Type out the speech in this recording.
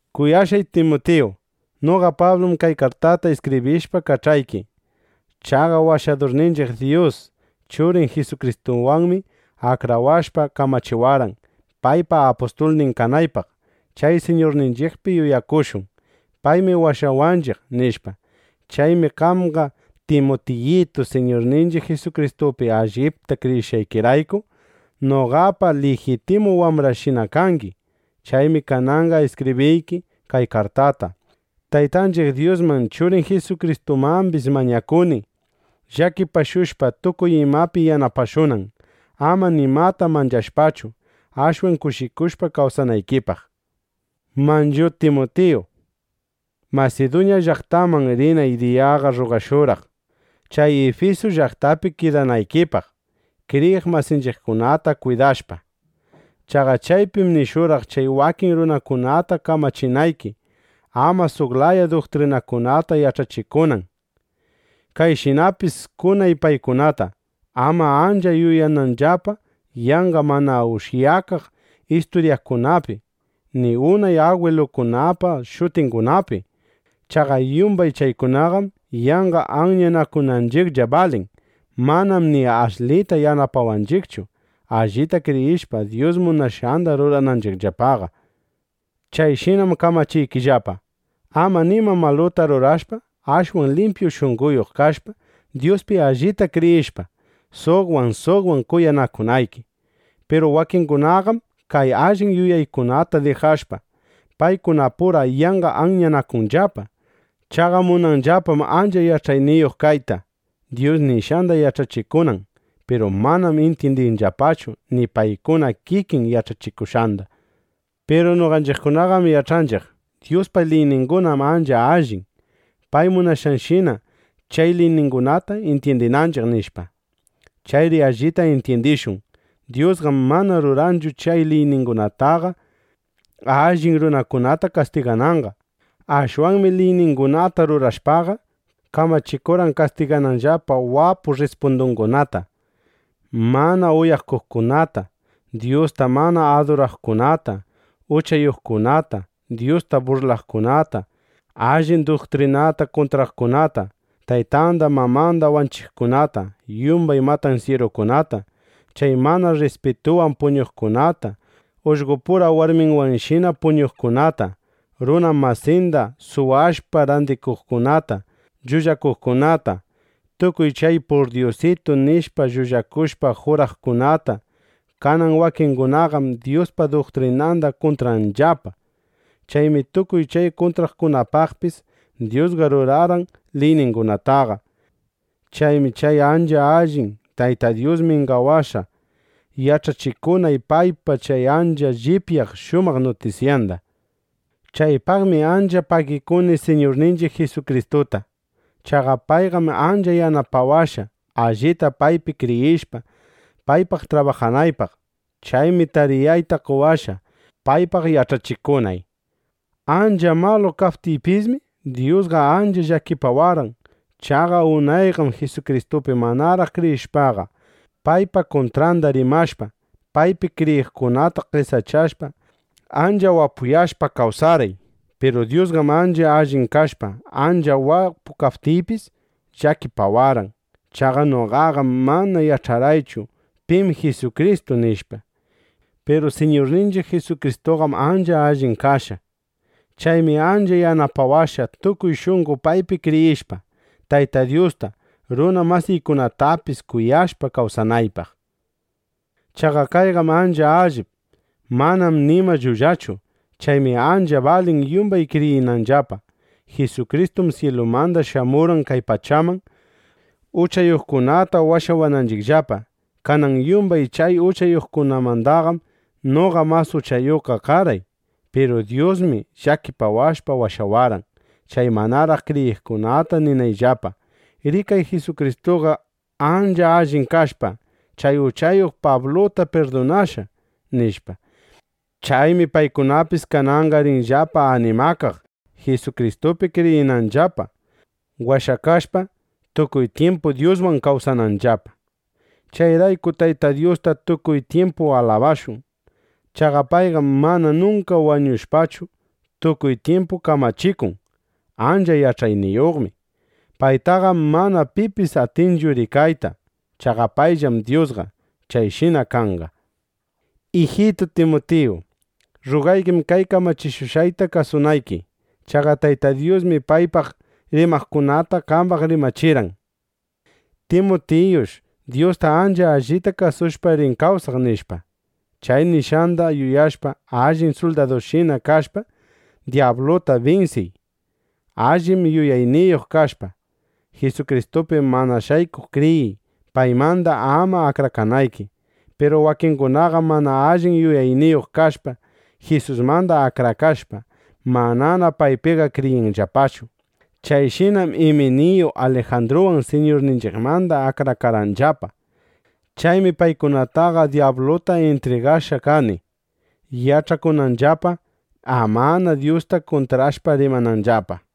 Kuyashqay Timutiyitu, noqa Pablum kay kartata iskibrishpa kach'ayki. Chaqa Washadurninchiq Dyus, Churin Jisukristuwanmi akrawashpa, kamachiwarqan, paypa apustulnin kanaypaq. Chay Siñurninchiqpi yuyakushun: Paymi washawanchiq, nishpa. Chaymi qamqa Timutiyitu, Siñurninchiq Jisukristupi allipta kriyishqaykirayku, noqapa lijitimu wambrayshina kangi. Chaymi kananqa iskibriyki kay kartata. Taytanchiq Dyusman Churin Jisukristumambis mañakuni, llakipashushpa, tukuy imapi yanapashunan, ama nimata manchashpachu, ashwan kushikushpa kawsanaykipaq. Manchu Timutiyu, Masiduña llaqtaman rinay diyaqa rrugashurqaq, chay Ifisu llaqtapi kidanaykipaq, kriyiq masinchiqkunata kwidashpa. Chaqa chaypim nishurqaq chay wakin runakunata kamachinayki, ama suq laya duktrinakunata yach'achikunan. Kayshinapis kunay paykunata, ama ancha yuyananllapa yanqa mana ushyakaq isturyakunapi, ni unay agwilungunapa shutingunapi. Chaqa yumbay chaykunaqam yanqa anyanakunanchiqlla balin. Manam ni ashlita yanapawanchiqchu, allita kriyishpa, Dyus munashqanda rurananchiqllapaqa. Chayshinam kamachiykillapa, ama nima maluta rurashpa, ashwan limpyu shunqoyuq kashpa, Dyuspi allipta kriyishpa, suqwan suqwan kuyanakunayki. Piru wakingunaqam kay allin yuyaykunata dijashpa, paykunapura yanqa anyanakunllapa. Chaqa munanllapam ancha yach'ayniyuq kayta, Dyus nishqanda yach'achikunan. Piru manam intyindinllapachu ni paykuna kikin yach'achikushqanda. Piru noqanchiqqam yach'anchiq: Dyuspa liyningunam ancha allin, pay munashqanshina chay liyningunata intyindiptinchiq, nishpa. Chayri allita intyindishun: Dyusqam mana rurarqanchu chay liyningunataqa, allin runakunata kastigananqa. Ashwanmi liyningunata rurashpaqa, kamachikurqan kastigananllapa wapu rrispundungunata, mana uyakuqkunata, Dyusta mana aduraqkunata, uchayuqkunata, Dyusta burlaqkunata, allin duktrinata kuntraqkunata, taytanda mamanda wanchiqkunata, yumbay matansyirukunata, chay mana rrispitunwan puñuqkunata, ullqopura warminwanshina puñuqkunata, runa masinda suwakushpa randikuqkunata, llullakuqkunata, tukuy chay “purdyusitu” nishpa llullakushpa juraqkunata. Kanan wakingunaqam Dyuspa duktrinanda kuntranllapa. Chaymi tukuy chay kuntraqkunapaqpis Dyusqa rurarqan liyningunataqa. Chaymi chay ancha allin Tayta Dyus mingawashqa, yach'achikunay paypa chay ancha llipyaq shumaq nutisyanda. Chaypaqmi ancha pagikuni Siñurninchiq Jisukristuta. Chaqa payqam ancha yanapawashqa, allita paypi kriyishpa, paypaq trabajanaypaq. Chaymi tariyayta qowashqa, paypaq yach'achikunay. Ancha malu kaptiypismi, Dyusqa ancha llakipawarqan. Chaqa unayqam Jisukristupi manaraq kriyishpaqa, paypa kuntranda rimashpa, paypi kriyiqkunata qesachashpa, ancha wapuyashpa kawsarqay. Piru Dyusqam ancha allin kashpa, ancha wapu kaptiypis, llakipawarqan. Chaqa noqaqam mana yach'arqaychu: Pim Jisukristu, nishpa. Piru Siñurninchiq Jisukristuqam ancha allin kashqa. Chaymi ancha yanapawashqa, tukuy shunqo paypi kriyishpa, Tayta Dyusta, runa masiykunatapis kuyashpa kawsanaypaq. Chaqa kayqam ancha allip. Manam nima llullachu. Chaymi ancha balin yumbay kriyinanllapa: Jisukristum syilumanda shamurqan kay pachaman, uchayuqkunata washawananchiqllapa. Kanan yumbay chay uchayuqmandaqam noqa mas uchayuqqa karqay. Piru Dyusmi llakipawashpa washawarqan, chay manaraq kriyiqkuna ninanllapa: “Rikay, Jisukristuqa ancha allin kashpa, chay uchayuq Pabluta pirdunashqa”, nishpa. Chaymi paykunapis kananqa rinllapa animakaq, Jisukristupi kriyinanllapa, washakashpa, tukuy tyimpu Dyuswan kawsananllapa. Chayrayku Tayta Dyusta tukuy tyimpu alabashun. Chaqa payqam mana nunka wañushpachu, tukuy tyimpu kamachikun. Ancha yach'ayniyuqmi. Paytaqam mana pipis atinchu rikayta. Chaqa payllam Dyusqa. Chayshina kanqa. Ijitu Timutiyu, rrugaykim kay kamachishushqayta kasunayki. Chaqa Tayta Dyusmi paypaq rimaqkunata qambaq rimachirqan: “Timutiyush Dyusta ancha allita kasushpa rin kawsaq”, nishpa. Chay nishqanda yuyashpa, allin suldadunshina kashpa, dyabluta binsiy. Allin yuyayniyuq kashpa, Jisukristupi mana shaykuq kriyiy, paymanda ama akrakanayki. Piru wakingunam mana allin yuyayniyuq kashpa, Jisusmanda akrakashpa, manana paypiqa kriyinllapachu. Chayshinam Iminiyu Alijandruwan Siñurninchiqmanda akrakarqanllapa. Chaymi paykunataqa dyabluta intrigashqa kani, yach'akunanllapa, amana Dyusta kuntrashpa rimananllapa.